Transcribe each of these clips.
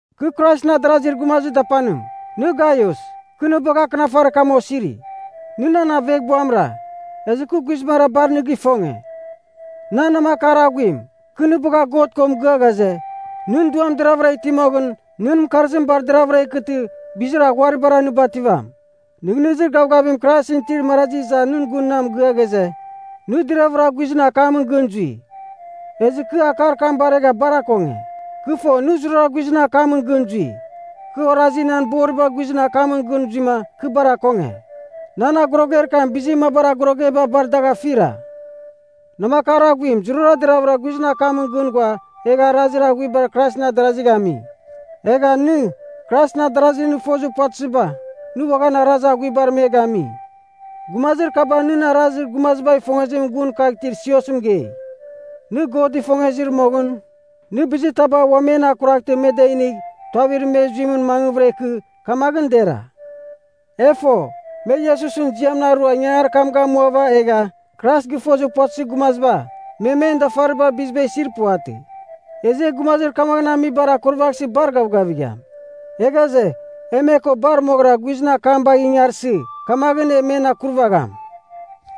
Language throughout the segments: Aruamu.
Kɨ Kraisɨn adarazir gumazir dapanim. Nɨ Gaius, kɨ nɨ bagh akɨnafarir kam osiri. Nɨ nan aveghbuamra, ezɨ kɨ guizbangɨra bar nɨ gifonge. Nan namakar aghuim, kɨ nɨ bagha God ko mɨgɨa ghaze, nɨn duam deravɨra iti moghɨn, nɨn mɨkarzim bar deravɨra ikɨtɨ, bizir aghuaribara nɨ bativam. Nɨghnɨzir gavgavim Kraisɨn itir marazi iza nɨn gun na mɨgɨa ghaze, nɨ deravɨra guizɨn akamɨn gɨn zui. Ezɨ kɨ akar kam baregha bar akonge. Kɨ fo, nɨ zurara guizɨn akamɨn gɨn zui. Kɨ orazi, nan boriba guizɨn akamɨn gɨn zuima kɨ bar akonge. Nan agoroger kam bizir mabar agorogeba bar dagh afira. Namakar aghuim, zurara deravɨra guizɨn akamɨn gɨn ghua egha arazir aghuiba Kraisɨn adarazigh ami. Egha nɨ, Kraisɨn adarazir nɨ fozir puvatɨziba, nɨ uaghan arazir aghuibar me gami. Gumazir kaba nɨn arazir gumazibagh ifongezimɨn gun kagh itir siosɨn mɨgei. Nɨ God ifongezir moghɨn, nɨ bizitaba ua men akuraghtɨ me da inigh tuavir me zuimɨn mangvɨra ikɨ, kamaghɨn dera. E fo, me Iesusɨn ziamɨn arua ingangarir kam gamuava egha, Krais gɨfozir puvatɨzir gumaziba, me men dafaribar biziba isir puvatɨ. Ezɨ e gumazir kamaghɨn amibar akurvaghsɨ bar gavgavigham. E ghaze, e me ko bar moghɨra, guizɨn akam bagh ingarsɨ, kamaghɨn e men akurvagham.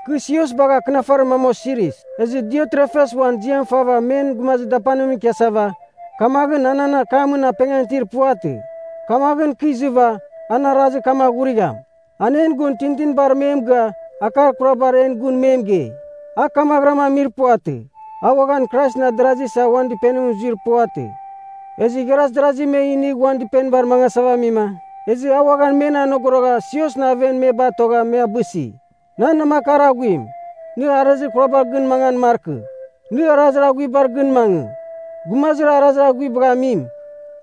Kɨ sios bagha akɨnafarir mam osiris. Ezɨ Diotrefes uan ziam fava men gumazir dapanimɨn ikiasava, kamaghɨn a nan akamɨn apengan itir puvatɨ. Kamaghɨn kɨ izɨva, an arazir kam aghurigham. An en gun tintinibar me mɨgɨa akar kurabar en gun me mɨgei. A kamaghɨram amir puvatɨ, a uaghan Kraisɨn adarazi isa uan dɨpenimɨn zuir puvatɨ. Ezɨ igharaz darazi me inigh uan dɨpenibar mangasava amima, ezɨ a uaghan men anogorogha siosɨn aven me batogha, me abɨsi. Nan namakar aghuim, nɨ arazir kurabar gɨn mangan markɨ, nɨ arazir aghuibar gɨn mangɨ. Gumazir arazir aghuibagh amim,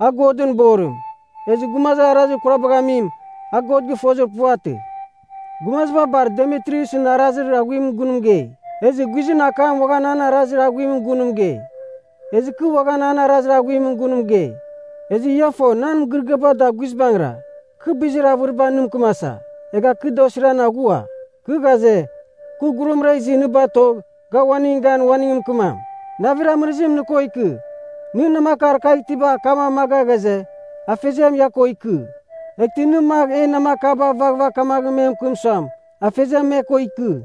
a Godɨn borim. Ezɨ gumazir arazir kurabagh amim, a God gɨfozir puvatɨ. Gumaziba bar Demitriusɨn arazir aghuimɨn gun mɨgei. Ezɨ guizɨn akam uaghan an arazir aghuimɨn gun mɨgei. Ezɨ kɨ uaghan an arazir aghuimɨn gun mɨgei. Ezɨ ia fo nan mɨgɨrɨgɨaba da guizbangɨra. Kɨ bizir avɨriba nɨ mɨkɨmasa, egha kɨ da osiran aghua. Kɨ ghaze, kɨ gurumra izɨ nɨ batogh ga uaningɨn gan uaningɨn mɨkɨmam. Navir amɨrɨzim nɨ ko ikɨ. Nɨn namakar kagh itiba akam amaga ghaze, Afeziam ia ko ikɨ. Eghtɨ nɨ magh en namakaba vaghvagh kamaghɨn me mɨkɨm suam, Afeziam me ko ikɨ.